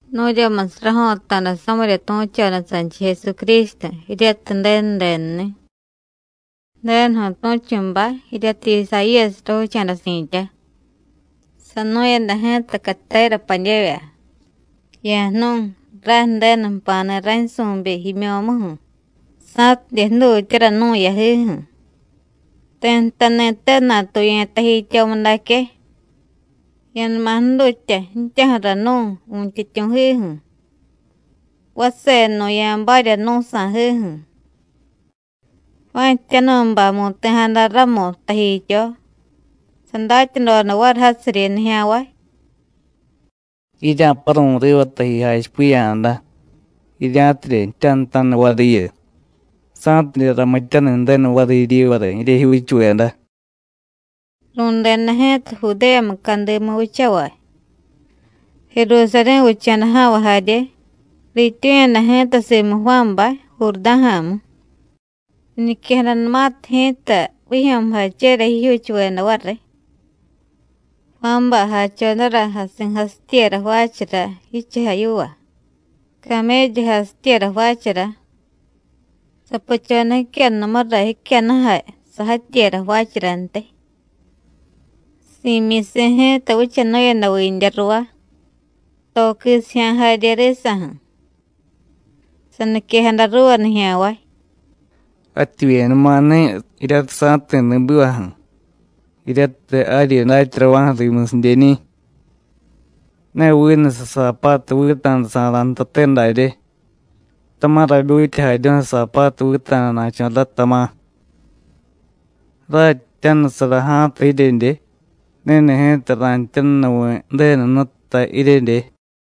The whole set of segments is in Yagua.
Nu̱ryamusiy rajo̱ta̱da samirya tu̱choda sanchiy Jesucrístu, jiryatiy Ju̱denu denuni̱. Ju̱denuju̱ tu̱chu̱bay jiryatiy Isayíyasiy ravicha̱da si̱tya, sanu̱yada ji̱ta catera padyevya: “Ya̱jnu̱y, ray Ju̱denu jpa̱ni̱ raynsu̱byi jimyo̱muju̱, sa̱tidye jdutyara nu̱ yajiju̱. Ti̱ jtani̱te natuye̱ tajityomudaque: Ya̱numa jdutya ji̱tyaju̱ra nú̱ Vu̱ntyityu̱jiju̱, vasenú̱ ya̱barya nú̱ sa̱jiju̱.” Juán Ji̱tyanu̱bay mu̱ti̱jada ramu tajityo. Sadatyadoda variy jasiryi nijya̱nvay: “Jirya̱paru̱y riva taji jachipiya̱jada, jirya̱tidye jtyanutaniy variyu, sa̱tidye ramityaniy Ju̱denu variy jiryivara jiryejyuuchuveda.” Ru̱deda ji̱ta Judéya mucadimu vichavay, Jerusarí̱ vicha̱da ja̱nvay jarye. Riityu̱yada ji̱ta simu Juánbay, Jurdá̱ja̱mu, riñiquejadanumatiy ji̱ta vijyo̱mujachera jijyuuchuveda variy. Juánbay jachodara jasi̱jasityera jvaachara jichujay yiva, caméllu jasityera jvaachara. Sapuchoda jicyannumura jicyannujay sajatyera jvaacharantiy. Si̱myisi̱ ji̱ta vichanu̱yada vindya ruvá, to quisijya̱ jarye risa̱ju̱. Saniquejada ruuva nijya̱nvay: “Jativyenumani̱ jiryatiy sa̱jti̱ ri̱bivaju̱, jiryatiy jaryi datyarava̱ju̱ rimusidyeñi̱. Ne vinu sasaapatu vita̱dasa̱ra̱ jtate darye, tama̱ rabyutyajaryu̱y sasaapatu vita̱dana̱cho̱ ray, tama̱. Ray jtyanusara ja̱a̱ta jiryedye, ni̱ni̱ ji̱ta ra̱jtyanunuvi̱ Ju̱denu Jnututa jiryedye.”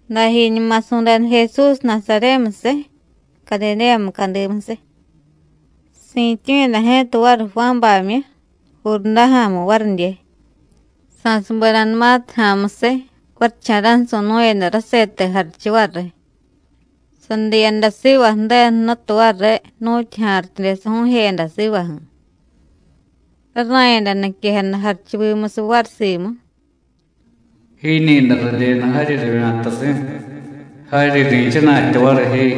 Dajiñuma su̱deda Jesús Nasaryémusiy, Cadidéya mucadimusiy. Si̱tyu̱yada ji̱ta variy Juánbamyu, Jurdá̱ja̱mu varidye. Sa̱subedanumatiy ja̱a̱musiy, varicha̱ra̱ju̱ su̱nu̱yada rasete jarichu variy, sadiyada siva Ju̱denu Jnutu variy, nu̱tyu ja̱rityude saju̱u̱jeyada sivaju̱. Rara̱yada niquejada jarichuvimusiy variy simu: “Jiiñi̱day radyenu jaryi ravya̱tasi̱. Jaryi ri̱chana̱tya variy ji.”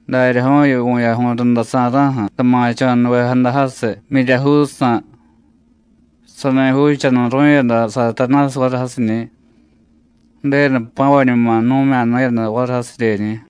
Daryaju̱yu vu̱yaju̱y rundasa̱ra̱ju̱ sama̱cho̱nuvejada jasiy, jmyiryajuujsa̱. Sani juuchanuru̱yada Satanásiy variy jasiñi̱. Ju̱denu jpa̱vañuma jnu̱mya̱nu̱yada variy jasidyeñi̱.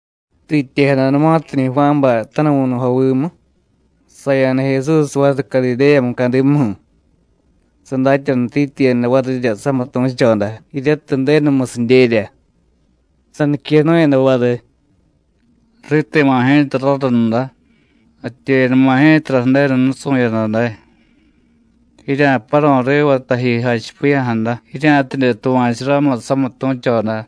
Riityejadanumatiñi̱ Juánbay tanuvu̱nujovimu, saya̱da Jesús variy Cadidéya mucadimuju̱, sadatyanutityiyada varirya samitu̱choda, jiryatiy Ju̱denumusidyerya. Saniquenu̱yada variy: “Riti̱ma̱ ji̱ta rarunda; jativyenuma ji̱tara Ju̱denu nusu̱yada day. Jirya̱paru̱y riva taji jachipiya̱jada, jirya̱tidye tuva̱chu ramu samitu̱choda.”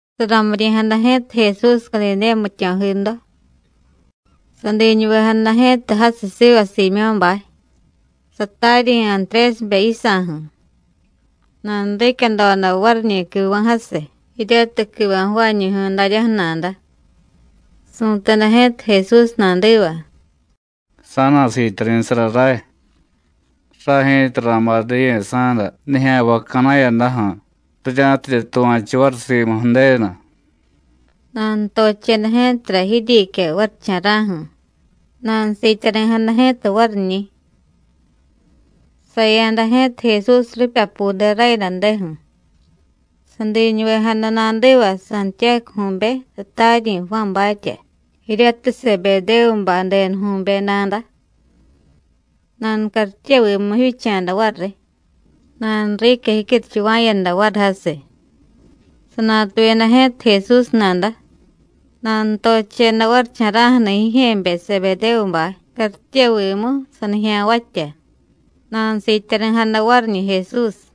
Saramiryi̱jada ji̱ta Jesús Cadidéya jmityo̱jido, sadiñuvejada ji̱ta jasiy siva Siimyó̱bay, sataryi̱ Antrésibe yisa̱ju̱. Nanuriicyadoda variñi̱ quiva̱ jasiy, jiryatiy quiva̱ jvaañu̱ju̱y daryaju̱ nada. Su̱teda ji̱ta Jesús nadiva: “Sa̱na̱siityari̱sara ray. Ray ji̱ta ra̱bay diye sa̱da nijya̱nvay ca̱na̱yadaju̱, rirya̱tidye tuva̱chu variy simu Ju̱denu.” Nanutocheda ji̱tara jiryiicya varicha̱ra̱ju̱, nanusiityari̱jada ji̱ta variñi̱. Saya̱da ji̱ta Jesús ripyapude rayadadeju̱, sadiñuvejada nadiva Santiyácuju̱be, sataryi̱ Juánbatya, jiryatiy Sebedévubay denuju̱be nada. Nanucartyevimu jivyicha̱da variy, nanuriicya jicyuruchuva̱yada variy jasiy. Sanatuyada ji̱ta Jesús nada, nanutocheda varicha̱ra̱ju̱ni̱ jijye̱be Sebedévubay cartyevimu sanijya̱nvatya, nanusiityari̱jada variñi̱ Jesús.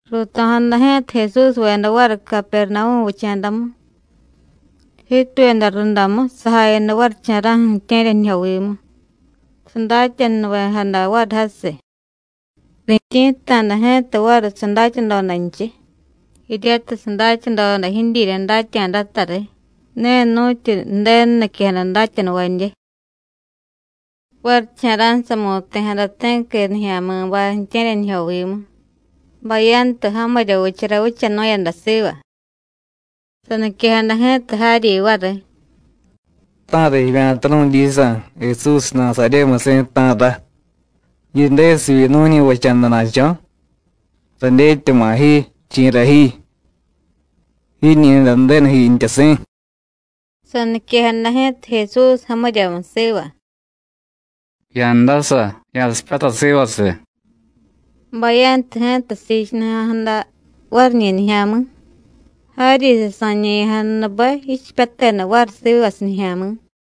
Ruuto̱jada ji̱ta Jesúsveda variy Capernavú̱ vicha̱damu. Jiituyada rundamu sajayada varicha̱ra̱ju̱ ju̱tye̱ryanijyovimu, sadatyanunuvejada variy jasiy. Rityi̱tta̱da ji̱ta variy sadatyadodanchiy, jiryatiy sadatyadoda jidyirya datya̱datariy, ne nu̱tyu Ju̱denu niquejada datyanuvadye. Varicha̱ra̱ju̱ samu̱ti̱jada ti̱qui nijya̱mi̱bay ju̱tye̱ryanijyovimu, bayantu jamirya vichara vichanu̱yada siva. Saniquejada ji̱ta jaryi variy: “¿Ta̱ra jivya̱ta nu̱dyisa̱, Jesús Nasaryémusi̱, ta̱ra? ¿Yidesivyi nu̱ñi̱vacha̱dana̱cho̱? Radyetyama̱ ji, chi̱ra ji. Jiiñi̱day Ju̱denu jiintyasi̱.” Saniquejada ji̱ta Jesús jamiryamu siva: “Ya̱ndasa, ya̱sipyatay sivasiy.” Bayantu ji̱ta siichunuja̱jada variñi̱ nijya̱mi̱, jaryi sasa̱ñe̱ya̱jadanube jichipyateda variy sivasiy nijya̱mi̱.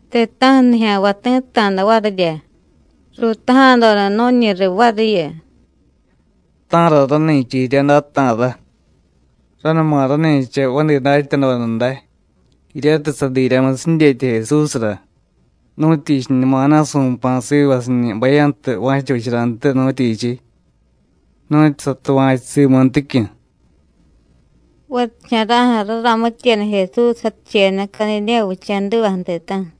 Ti̱ta̱ju̱ nijya̱nvay ti̱tta̱da varirya, ruutaja̱doda nu̱ñi riy variyu: “¿Ta̱ra rani̱cha jirya day, ta̱ra? Ranuma rani̱cha vadi datyadoda day, jiryatiy sadiryamusiy jidyetya Jesúsra. ¿Nu̱tyichiñumana̱ su̱pa̱ sivasiñi̱ bayantu va̱cha vicharantiy, nu̱tyichiy? nu̱tyu satuva̱chu simunticyu̱.” Varicha̱ra̱ju̱ raramityeda Jesús jaticheyada Cadidéya vicha̱divaju̱ ti̱ta̱ju̱.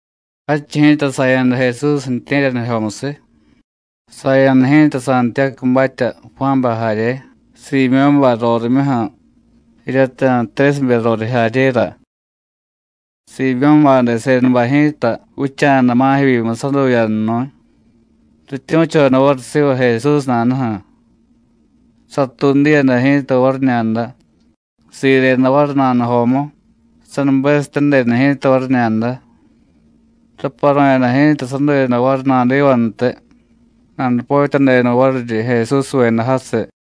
Jadchiy ji̱ta saya̱da Jesús ju̱tye̱ryanijyomusiy. Saya̱da ji̱ta Santiyácubatya, Juánbay jarye, Siimyó̱bay rorimyuju̱, jiryatiy Antrésibe roriy jaryera. Siimyó̱bay desedabay ji̱ta vicha̱da ma̱jevyimu saduyannu̱y, rityu̱choda variy siva Jesús nadaju̱. Satuudiyada ji̱ta variñada, sireda variy nanujomu, sanubesityadeda ji̱ta variñada. Raparu̱yada ji̱ta saduyada variy nadivantiy, nanupotyadeda variryi Jesúsveda jasiy.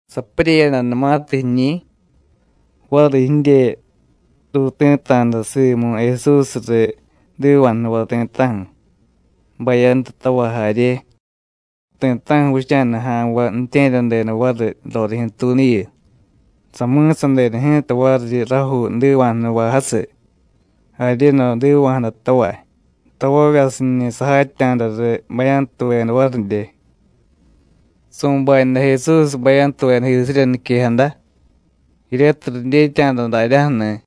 Sapuryeyadanumatiy jiñi̱, varijidye ruuti̱ta̱da simu Jesús riy jdiva̱jnuvay ti̱ta̱ju̱, bayantutavay jarye. Ti̱ta̱ju̱ vicha̱da ja̱nvay ju̱tye̱ryadeda variy rorijyu̱tuunuyu. Sami̱sadeda ji̱ta variryi rajuu jdiva̱jnuvay jasiy, jaryedo jdiva̱jadatavay, tavavyasiñi̱ sajatya̱da riy bayantuveda varidye. Su̱bayada Jesús bayantuvedajisirya niquejada, jiryatiy ridyetya̱da daryaju̱ni̱.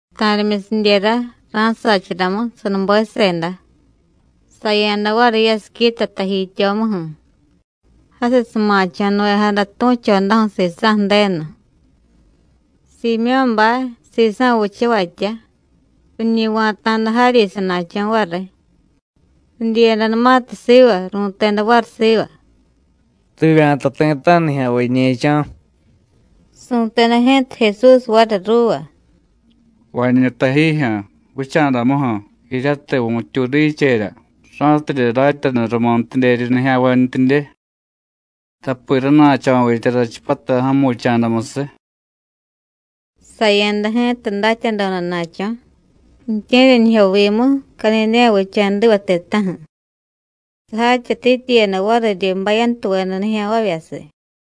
Ta̱rimyusidyera ra̱sacharamu, sanubeseda, saya̱da variy yasiquita tajityomuju̱. Jasiy sama̱cho̱nuvejada tu̱chodaju̱ sisa̱ Ju̱denu. Siimyó̱bay, sisa̱ vichavatya, riñi va̱ta̱da jaryi sana̱cho̱ variy. Ridyiyadanumatiy siva, ru̱teda variy siva: “Rivya̱ta ti̱ta̱ju̱ nijya̱nvay jiñe̱cho̱.” Su̱teda ji̱ta Jesús variy ruuva: “Vañú tajijyu̱, vicha̱damuju̱, jiryatiy vu̱tyuudicherya, ra̱tidye datyanu rumuntidyeryi nijya̱nvantyidye, tapi rana̱cho̱vitya rachipyatay ja̱mu vicha̱damusiy.” Saya̱da ji̱ta datyadodana̱cho̱, ju̱tye̱ryanijyovimu, Cadidéya vicha̱diva ti̱ta̱ju̱. Sajatyatityiyada variryi bayantuveda nijya̱nvavyasiy.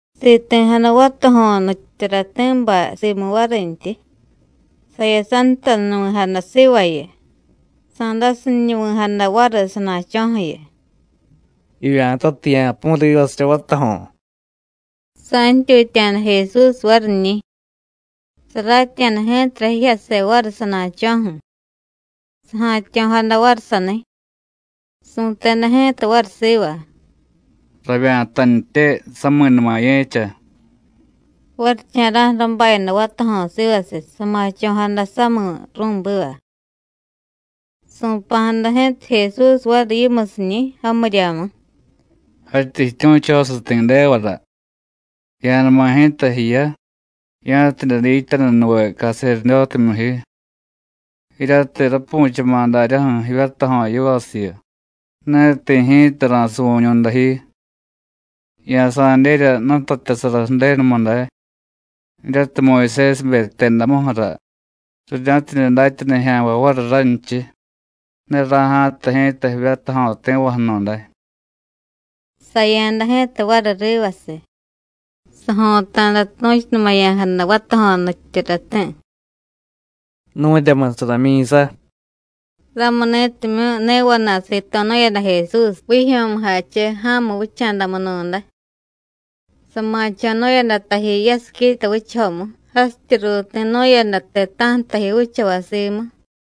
Siti̱jada vatajo̱ nutyityurati̱bay simu varintyi. Sayasantanuvi̱jada sivayu, sa̱dasiñunuvi̱jada variy sana̱cho̱ju̱yu: “Jivya̱tatiy ya̱pu̱y rivasirya vatajo̱.” Sa̱ntyutya̱da Jesús variñi̱, saratya̱da ji̱tara jijyase variy sana̱cho̱ju̱, saja̱tyo̱jada variy saniy. Su̱teda ji̱ta variy siva: “Ravya̱tantye, sami̱numa ye̱cha.” Varicha̱ra̱ju̱ rabayada vatajo̱ sivasiy, sama̱cho̱jada sami̱ ru̱biva. Su̱pa̱jada ji̱ta Jesús variy yimusiñi̱, jamiryamu: “Jatyí jityu̱chosiy ti̱devara. Ya̱numa ji̱ta jiya, ya̱tidye dityanunuve caserdótemyu ji. Jiryatiy rapu̱chama̱ daryaju̱ jivyatajo̱ yivasiyu, ne ti̱ ji̱ta ra̱suvu̱ñu̱day ji. Ya̱sa̱dyerya jnutatyasara Ju̱denumu day, jiryatiy Muyusésibe jtedamuju̱ra, rirya̱tidye datya nijya̱nvay variy ranchiy: Ne ra̱ja̱tay ji̱ta jivyatajo̱ ti̱vaju̱nu̱day.” Saya̱da ji̱ta variy rivasiy, sajo̱ta̱da tu̱chunumaya̱jada vatajo̱ nutyityurati̱: “Nu̱ryamusiy ramyi̱sa.” Ramuni̱timyu̱ ne vana̱y sito̱nu̱yada Jesús vijyo̱mujache ja̱mu vicha̱damunu̱day. Sama̱cho̱nu̱yada taji yasiquita vichajomu, jasityi ruuti̱nu̱yada ti̱ta̱ju̱ taji vichavay simu.